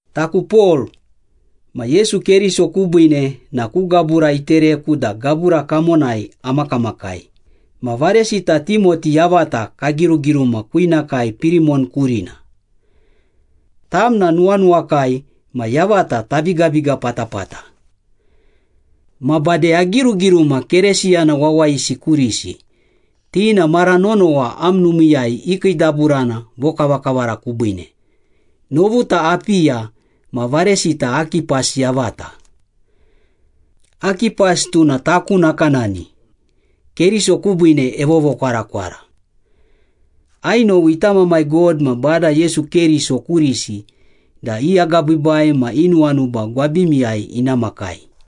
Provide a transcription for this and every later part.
Taku Pol, ma Yesu Keriso kubiine na ku gabura itereku da gabura kamonai amakamakai ma varesita Timoti yavata kagirugiruma kwinakai Pirimon kurim. Tam na nuwanuwakai ma yavata tabigabiga patapata. Ma bade agirugiruma Keresiyana wawayisi kurisi, ti na mara nonowa am numiiyai ikiidaburana vokavakavara kubiine, novuta Apiya ma varesita Akipas yavata. Akipas tuna taku nakanani, Keriso kubiine evovokwarakwara. Ainowi ita Mamai God ma Bada Yesu Keriso kurisi da i agabiibai ma i nuwanuba gwabimiyai ina makai.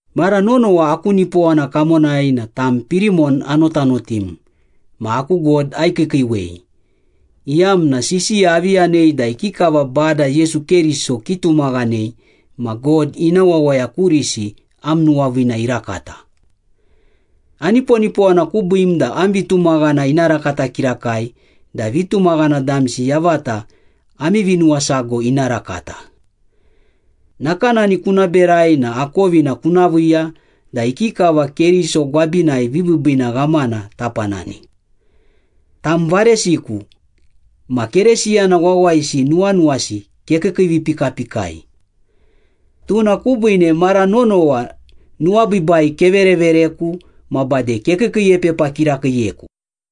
Mara nonowa aku nipowana kamonai na tam Pirimon anotanotim ma aku God aikiikiiwei, iyamna sisiya avi yanei da ikikava Bada Yesu Keriso kitumaghanei ma God ina wawaya kurisi am nuwaviina irakata. Aniponipowana kubiim da am vitumaghana ina rakata kirakai da vitumaghana damsi yavata ami vinuwasago ina rakata. Nakanani kuna berai na akovina kuna viiya da ikikava Keriso gwabinai vibiibiina ghamana tapanani. Tam varesiku, ma Keresiyana wawayisi nuwanuwasi kekiikiivipikapikai. Tuna kubiine mara nonowa nuwabiibai keverevereku ma bade kekiikiiepepa kirakiiyeku.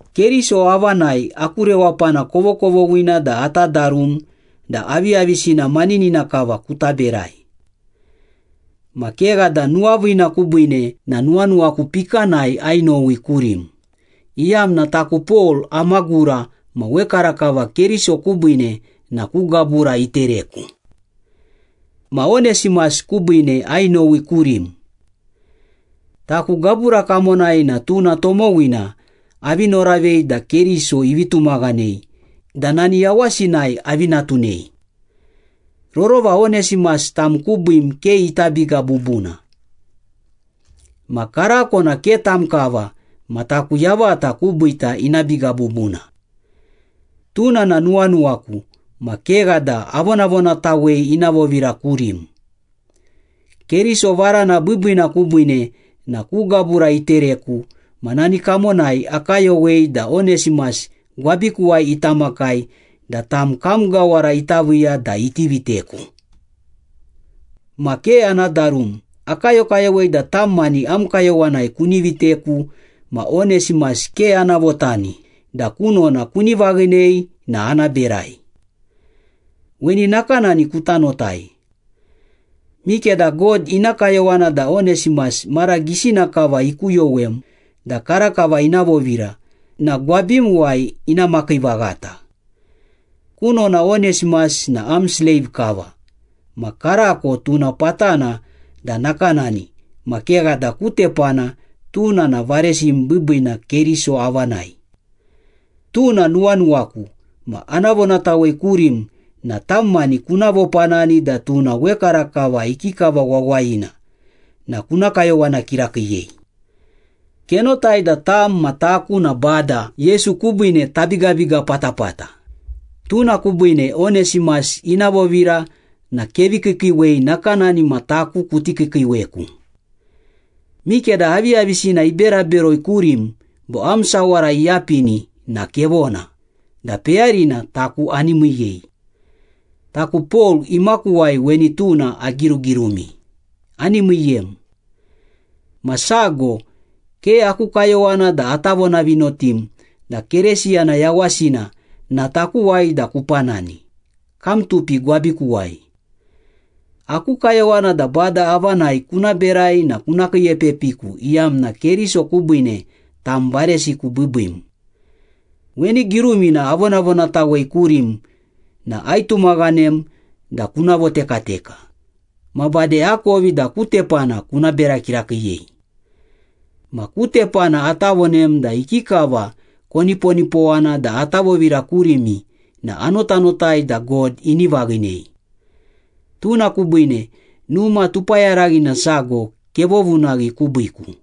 Keriso avanai aku rewapana kovokovoghina da ata darum da aviyavisina maninina kava kuta berai. Ma kegha da nuwaviina kubiine na nuwanuwaku pikanai ainowi kurim, iyamna taku Pol amagura ma wekarakava Keriso kubiine na ku gabura itereku. Ma Onesimas kubiine ainowi kurim. Taku gabura kamonai na tuna tomowina avi noravei da Keriso ivi tumaghanei da nani yawasinai avi natunei. Rorova Onesimas tam kubiim ke ita biga bubuna. Ma karako na ke tam kava ma taku yavata kubiita ina biga bubuna. Tuna na nuwanuwaku ma kegha da avonavonatawei ina vovira kurim. Keriso varana biibiina kubiine na ku gabura itereku ma nani kamonai akayowei da Onesimas gwabikuwai ita makai da tam kam gawara ita viiya da iti viteku. Ma ke ana darum, akayokayowei da tam mani am kayowanai kuni viteku ma Onesimas ke ana votani da kunona kuni vaghinei na ana berai. Weni nakanani kuta notai. Mikeda God ina kayowana da Onesimas mara gisina kava ikuyowem da karakava ina vovira na gwabimuwai ina makii vaghata. Kunona Onesimas na am sleiv kava, ma karako tuna patana da nakanani ma kegha da ku tepana tuna na varesim biibiina Keriso avanai. Tuna nuwanuwaku ma ana vonatawei kurim na tam mani kuna vopanani da tuna wekarakava ikikava wawayina na kuna kayowana kirakiiyei. Kenotai da tam ma taku na Bada Yesu kubiine tabigabiga patapata, tuna kubiine Onesimas ina vovira na kevi kiikiiwei nakanani ma taku kuti kiikiiweku. Mikeda aviyavisina ibera beroi kurim bo am sawara iyapini na kevona, da peyarina taku ani miiyei. Taku Pol imakuwai weni tuna agirugirumi, “Ani miiyem!” Ma sago, ke aku kayowana da ata vonavinotim da Keresiyana yawasina na takuwai da kupanani, kam tupi gwabikuwai. Aku kayowana da Bada avanai kuna berai na kuna kiiepepiku iyamna Keriso kubiine tam varesiku biibiim. Weni girumina avonavonatawei kurim na aitumaghanem da kuna votekateka, ma bade akovi da ku tepana kuna bera kirakiiyei. Ma ku tepana ata vonem da ikikava koniponipowana da ata vovira kurimi na anotanotai da God ini vaghinei. Tuna kubiine numa tupayaraghina sago kevovunaghi kubiiku.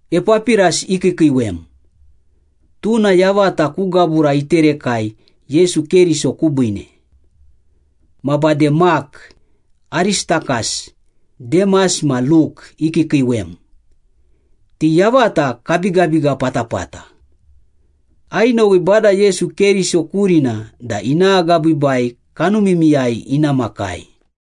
Epapiras ikiikiiwem. Tuna yavata ku gabura iterekai Yesu Keriso kubiine. Ma bade Mak, Aristakas, Demas ma Luk ikiikiiwem. Ti yavata kabigabiga patapata. Ainowi Bada Yesu Keriso kurina da ina agabiibai kanumimiyai ina makai.